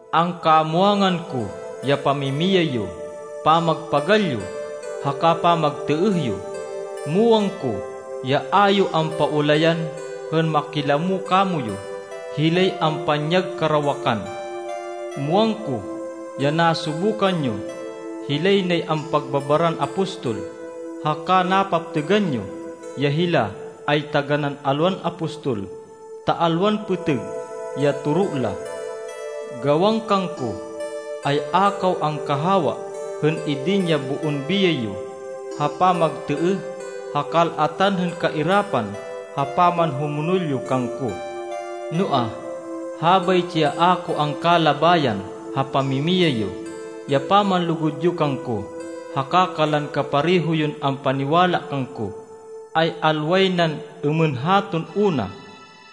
Angkamwangan ko ya pamimiyay yo, pamagpagal yo, haka pamagtêêh yo. Muwang ko, ya a yo ampaulayan hên makilamo kamoyu hilay ampanyag karawakan. Muwang ko ya nasubukan yo hilay nay ampagbabaran apostol, haka napaptêgan yo ya hila ay taganán alwan apostol, ta alwan pêtêg ya toro la. Gawan kangko ay a kaw angkahawa hên idin ya boon biyay yo ha pamagtêêh ha kal-atan hên kairapan ha pamanhumonol yo kangko. Noa, habaytsi ya a ko angkalabayan ha pamimiyay yo: ya pamanlugud yo kangko haka kanlan kapareho yon ampaniwala kangko, ay alway nan êmên haton una,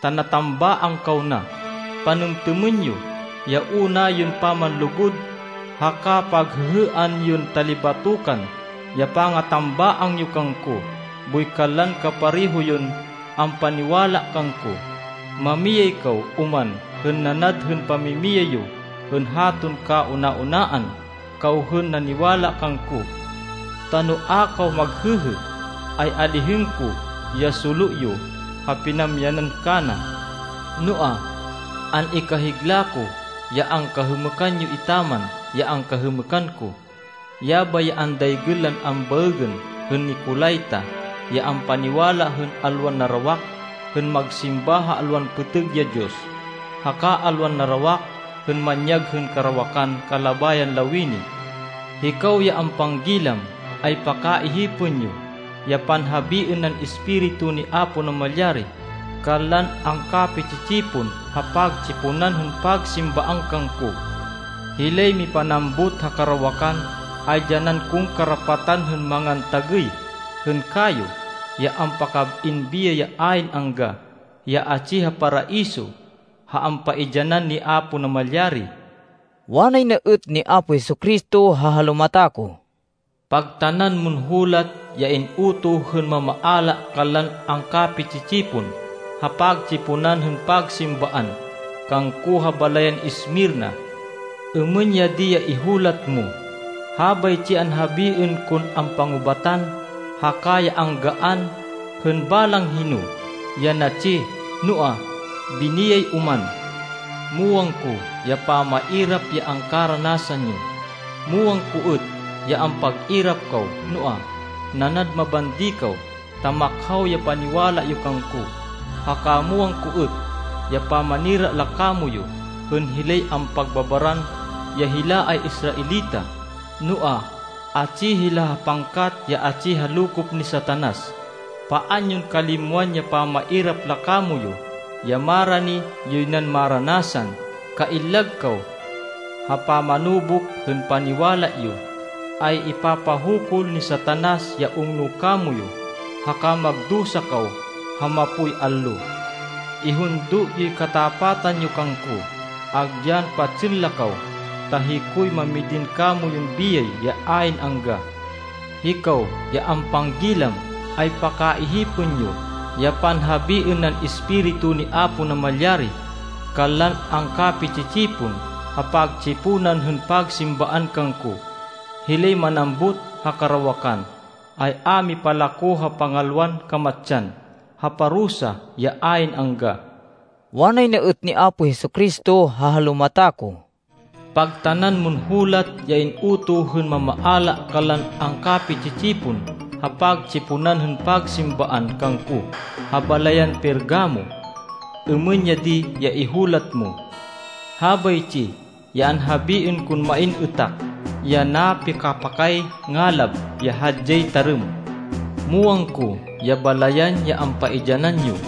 ta natambaang kaw na. Panêmtêmên yo ya una yon pamanlugud, haka paghêhêan yon talibatokan ya pangatambaang yo kangko boy kanlan kapareho yon ampaniwala kangko. Mamiyay kaw oman hên nanad hên pamimiyay yo hên haton kauna-unaan kaw hên naniwala kangko, ta no a kaw maghêhê, ay alihên ko ya solo yo ha pinamyanan kana. Noa, an-ikahigla ko, ya angkahêmêkan yo etaman ya angkahêmêkan ko, yabay ya andaygên lan ambaêgên hên Nicolaita, ya ampaniwala hên alwan narawak hên magsimba ha alwan pêtêg ya diyos, haka alwan narawak hên manyag hên karawakan kalabayan lawini. “Hikaw ya ampanggilam, ay pakaihipên yo ya panhabiên nan Espiritu ni Apo Namalyari kanlan angkapi-tsi-tsipon ha pagtsiponan hên pagsimbaan kangko! Hilay mipanambut ha karawakan, ay dyanan kon karapatan hên mangan tagêy hên kayo ya ampakab-in biyay ya ayn angga, ya atsi ha Paraiso, ha ampaidyanan ni Apo Namalyari.” Wanay na êt ni Apo Jesu-Cristo ha halumata ko, “Pagtanan mon hulat ya in-utoh hên mamaala kanlan angkapi-tsi-tsipon ha pagtsiponan hên pagsimbaan kangko ha balayan Esmirna. Êmên ya di ya ihulat mo: “Habaytsi ya anhabiên kon ampangubatan haka ya anggaan hên balang hino, ya natsi, noa, biniyay oman. Muwang ko ya pamairap ya angkaranasan yo. Muwang ko êt ya ampag-irap kaw, noa, nanad mabandi kaw, ta makhaw ya paniwala yo kangko. Haka muwang ko êt ya pamanira la kamoyu, hên hilay ampagbabaran ya hila ay Israelita, noa, atsi hila ha pangkat ya atsi ha lokop ni Satanas. Paan yon kalimwan ya pamairap la kamoyu ya marani yoy nan maranasan. Kaillag kaw! Ha pamanubuk hên paniwala yo, ay ipapahukul ni Satanas ya ungno kamoyu, haka magdusa kaw ha mapoy allo. Ihundo yoy katapatan yo kangko, agyan patsên la kaw, ta hikoy mamidin kamoyun biyay ya ayn angga. “Hikaw ya ampanggilam, ay pakaihipên yo ya panhabiên nan Espiritu ni Apo Namalyari kanlan angkapi-tsi-tsipon ha pagtsiponan hên pagsimbaan kangko! Hilay manambut ha karawakan, ay a mipalako ha pangalwan kamatsan, ha parusa ya ayn angga.” Wanay na êt ni Apo Jesu-Cristo ha halumata ko, “Pagtanan mon hulat ya in-utoh hên mamaala kanlan angkapi-tsi-tsipon ha pagtsiponan hên pagsimbaan kangko ha balayan Pergamo. Êmên ya di ya ihulat mo: “Habaytsi ya anhabiên kon main êtak ya napikapakay ngalab ya hadyay tarêm: Muwang ko ya balayan, ya ampaidyanan yo,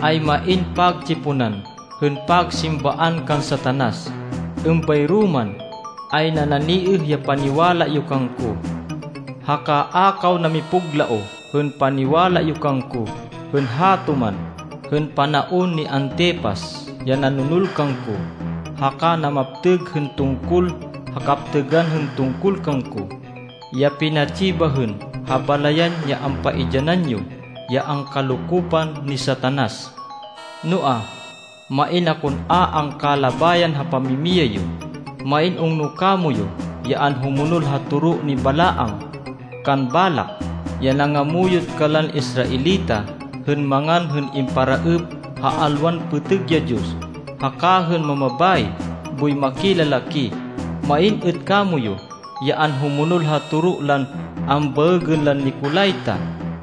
ay main pagtsiponan hên pagsimbaan kan Satanas. Êmbayro man, ay nananiêh ya paniwala yo kangko. Haka a kaw namipuglaoh hên paniwala yo kangko hên hato man hên panaon ni Antipas, ya nanonol kangko haka namaptêg hên tungkol ha kaptêgan hên tungkol kangko, ya pinatsi bahên ha balayan ya ampaidyanan yo, ya angkalokopan ni Satanas. Noa, main akon a angkalabayan ha pamimiyay yo. Main ungno kamoyu ya anhumonol ha toro ni Balaam kan Balak, ya nangamuyot kanlan Israelita hên mangan hên imparaêp ha alwan pêtêg ya diyos, haka hên mamabayi boy makilalaki. Main êt kamoyu ya anhumonol ha toro lan ambaêgên lan Nicolaita,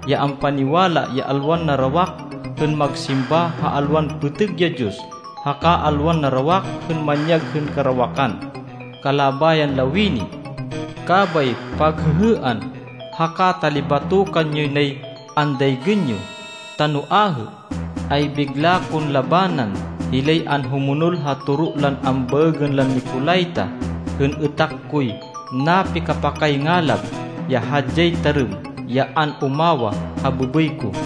ya ampaniwala ya alwan narawak hên magsimba ha alwan pêtêg ya diyos, haka alwan narawak hên manyag hên karawakan kalabayan lawini. Kabay paghêhêan haka talibatokan yoy nay andaygên yo, ta no ahê, ay bigla kon labanan hilay anhumonol ha toro lan ambaêgên lan Nicolaita, hên êtak koy napikapakay ngalab ya hadyay tarêm ya an-umawah ha bêbêy ko.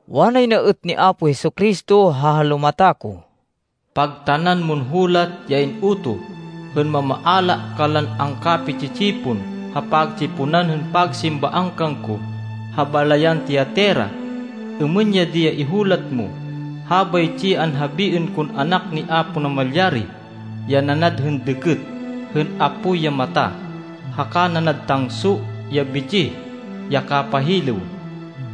Wanay na êt ni Apo Jesu-Cristo ha halumata ko, “Pagtanan mon hulat ya in-utoh hên mamaala kanlan angkapi-tsi-tsipon ha pagtsiponan hên pagsimbaan kangko ha balayan Tiatira. Êmên ya di ya ihulat mo: “Habaytsi ya anhabiên kon Anak ni Apo Namalyari, ya nanad hên dêkêt hên apoy ya mata, haka nanad tangso ya bitsih, ya kapahilêw.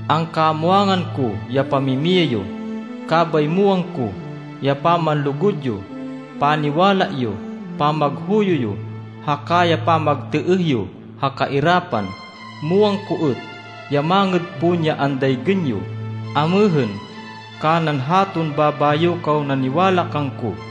Angkamwangan ko ya pamimiyay yo, kabay muwang ko ya pamanlugud yo, paniwala yo, pamaghuyo yo, haka ya pamagtêêh yo ha kairapan. Muwang ko êt ya mangêd pon ya andaygên yo amêhên kanan haton babayo kaw naniwala kangko.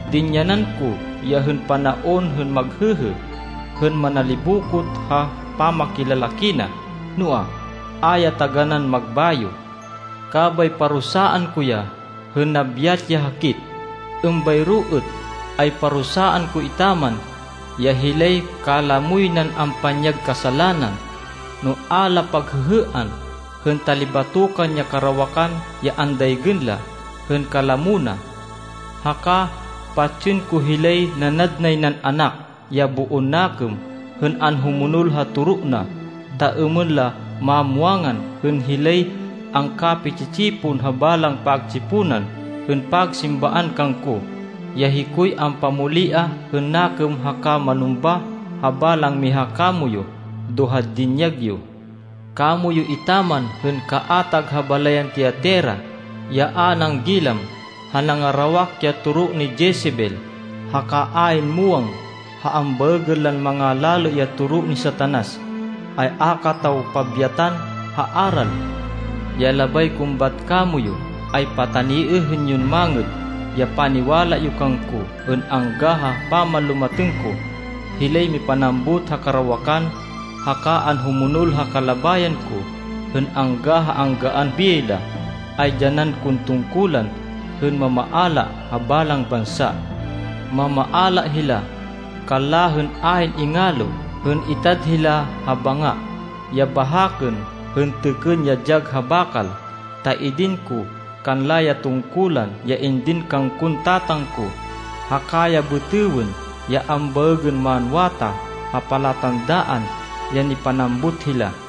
Dinyanan ko ya hên panaon hên maghêhê, hên manalibokot ha pamakilalaki na, noa, a ya taganán magbayo. Kabay parusaan ko ya hên nabyat ya hakit. Êmbayro êt, ay parusaan ko etaman, ya hilay kalamoy nan ampanyag kasalanan, no a la paghêhêan hên talibatokan ya karawakan ya andaygên la hên kalamo na. Haka patsên ko hilay nanad nay nan anak, ya boon nakêm hên anhumonol ha toro na, ta êmên la mamwangan hên hilay angkapi-tsi-tsipon ha balang pagtsiponan hên pagsimbaan kangko, ya hikoy ampamoliah hên nakêm haka manumbah ha balang miha kamoyu, do ha dinyag yo. “Kamoyu etaman hên kaatag ha balayan Tiatira, ya a nanggilam ha nangarawak ya toro ni Jezebel, haka ayn muwang ha ambaêgên lan mangalalê ya toro ni Satanas, ay a kataw pabyatan ha aral. Ya labay kon bat kamoyu, ay pataniêhên yon mangêd ya paniwala yo kangko hên angga ha pamanlumatêng ko. Hilay mipanambut ha karawakan, haka anhumonol ha kalabayan ko hên angga ha anggaan biyay la, ay dyanan kon tungkulan hên mamaala ha balang bansa. Mamaala hila kanla hên ayn ingalo hên itad hila ha banga, ya bahakên hên têkên ya dyag ha bakal. Ta idin ko kanla ya tungkulan ya indin kangkon Tatang ko, haka ya bêtêwên ya ambaêgên manwatah ha palatandaan ya nipanambut hila.